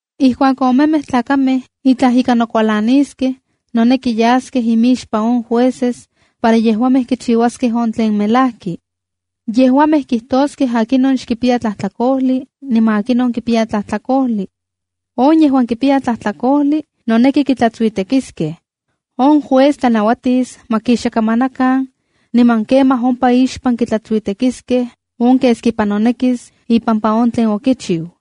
’Ijkuak omemej tlakamej itlaj ika nokualaniskej, noneki yaskej imixpan on jueces para yejuamej kichiuaskej on tlen melajki. Yejuamej kitoskej akinon xkipiya tlajtlakojli niman akinon kipiya tlajtlakojli. On yejuan kipiya tlajtlakojli, noneki kitlatsuitekiskej. On juez tlanauatis ma kixakamanakan, niman kemaj ompa ixpan kitlatsuitekiskej on keskipa nonekis ipampa on tlen okichiu.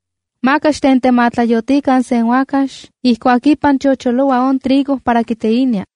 ’Maka xtentematlayotikan sen uakax ijkuak ipan chocholoua on trigo para kiteinia.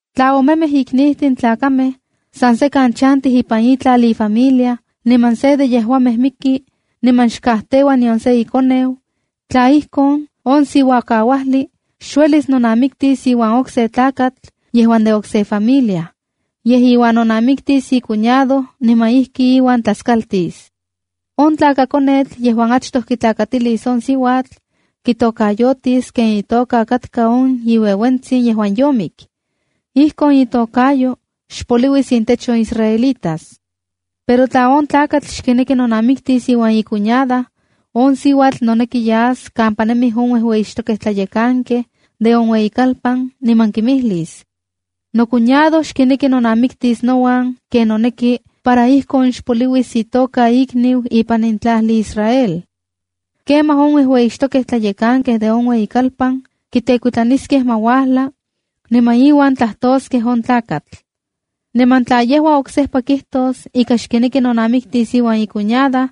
’Tla omemej iknijtin tlakamej san sekan chantij ipan itlal infamilia niman se de yejuamej miki niman xkajteua nion se ikoneu, tla ijkon, on siuakauajli xuelis nonamiktis iuan okse tlakatl yejuan de okse familia. Yej, iuan nonamiktis icuñado niman ijki iuan tlaskaltis. On tlakakonetl yejuan achtoj kitlakatilis on siuatl, kitokayotis ken itoka katka on iueuentsin yejuan yomik. Ijkon itokayo xpopoliuis intech on israelitas. Pero tla on tlakatl xkineki nonamiktis iuan icuñada, on siuatl noneki yas kampa nemij on uejueyixtokej tlayekankej de on ueyikalpan niman kimijlis: “Nocuñado xkineki nonamiktis nouan ken noneki para ijkon xpopoliuis itoka ikniu ipan in tlajli Israel.” Kemaj on uejueyixtokej tlayekankej de on ueyikalpan kitekuitlaniskej ma uajla, niman iuan tlajtoskej on tlakatl. Niman tla yejua oksejpa kijtos ika xkineki nonamiktis iuan icuñada,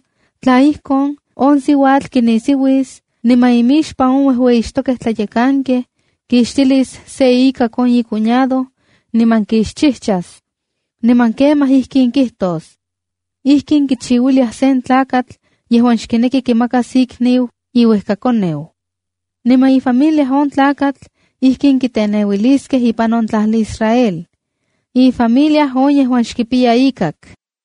tla ijkon, on siuatl kinisiuis niman imixpan on uejueyixtokej tlayekankej, kixtilis se ikak on icuñado, niman kixchijchas. Niman kemaj ijkin kijtos: “¡Ijkin kichiuiliaj sen tlakatl yejuan xkineki kimakas ikniu iuejkakoneu!” Niman ifamilia on tlakatl ijkin kiteneuiliskej ipan on tlajli Israel: “Ifamilia on yejuan xkipiya ikak.”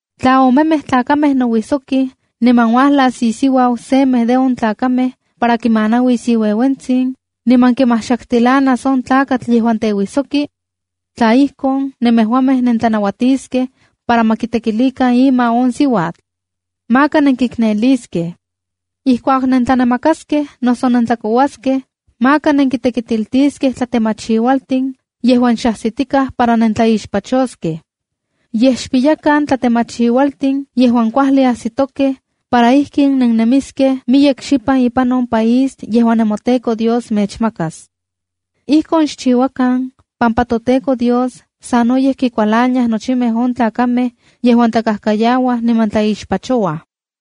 ’Tla omemej tlakamej nouijsokij niman uajlas isiuau semej de on tlakamej para kimanauis iueuentsin, niman kimajxaktilanas on tlakatl yejuan teuisoki, tla ijkon, nemejuamej nentlanauatiskej para ma kitekilikan ima on siuatl. Maka nenkikneliskej. ’Ijkuak nentlanamakaskej noso nentlakouaskej, maka nenkitekitiltiskej tlatemachiualtin yejuan xajsitikaj para nentlaixpachoskej. Yej, xpiyakan tlatemachiualtin yejuan kuajli ajsitokej para ijkin nennemiskej miyek xipan ipan on país yejuan nemoTEKO Dios mechmakas. Ijkon xchiuakan pampa toTEKO Dios sanoyej kikualaniaj nochimej on tlakamej yejuan tlakajkayauaj niman tlaixpachouaj.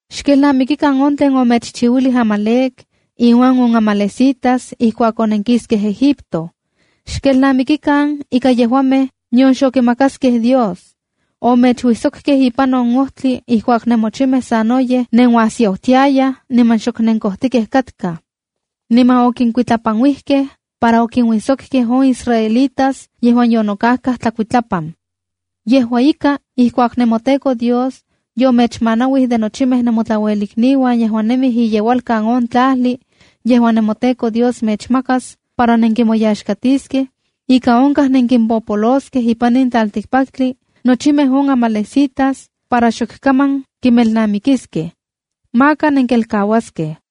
’Xkelnamikikan on tlen omechchiuilij Amalec inuan on amalecitas ijkuak onenkiskej Egipto. Xkelnamikikan ika yejuamej nion xokimakaskej Dios. Omechuijsokkej ipan ojtli ijkuak nemochimej sanoyej nenuajsiautiayaj niman xok nenkojtikej katkaj. Niman okinkuitlapanuijkej para okinuijsokkej on israelitas yejuan yonokajkaj tlakuitlapan. Yejua ika, ijkuak nemoTEKO Dios yomechmanauij de nochimej nemotlauelikniuan yejuan nemij iyeualkan on tlajli yejuan nemoTEKO Dios mechmakas para nenkimoyaxkatiskej, ika onkaj nenkimpopoloskej ipan in tlaltikpaktli nochimej on amalecitas para xok kaman kinmelnamikiskej. ¡Maka nenkelkauaskej!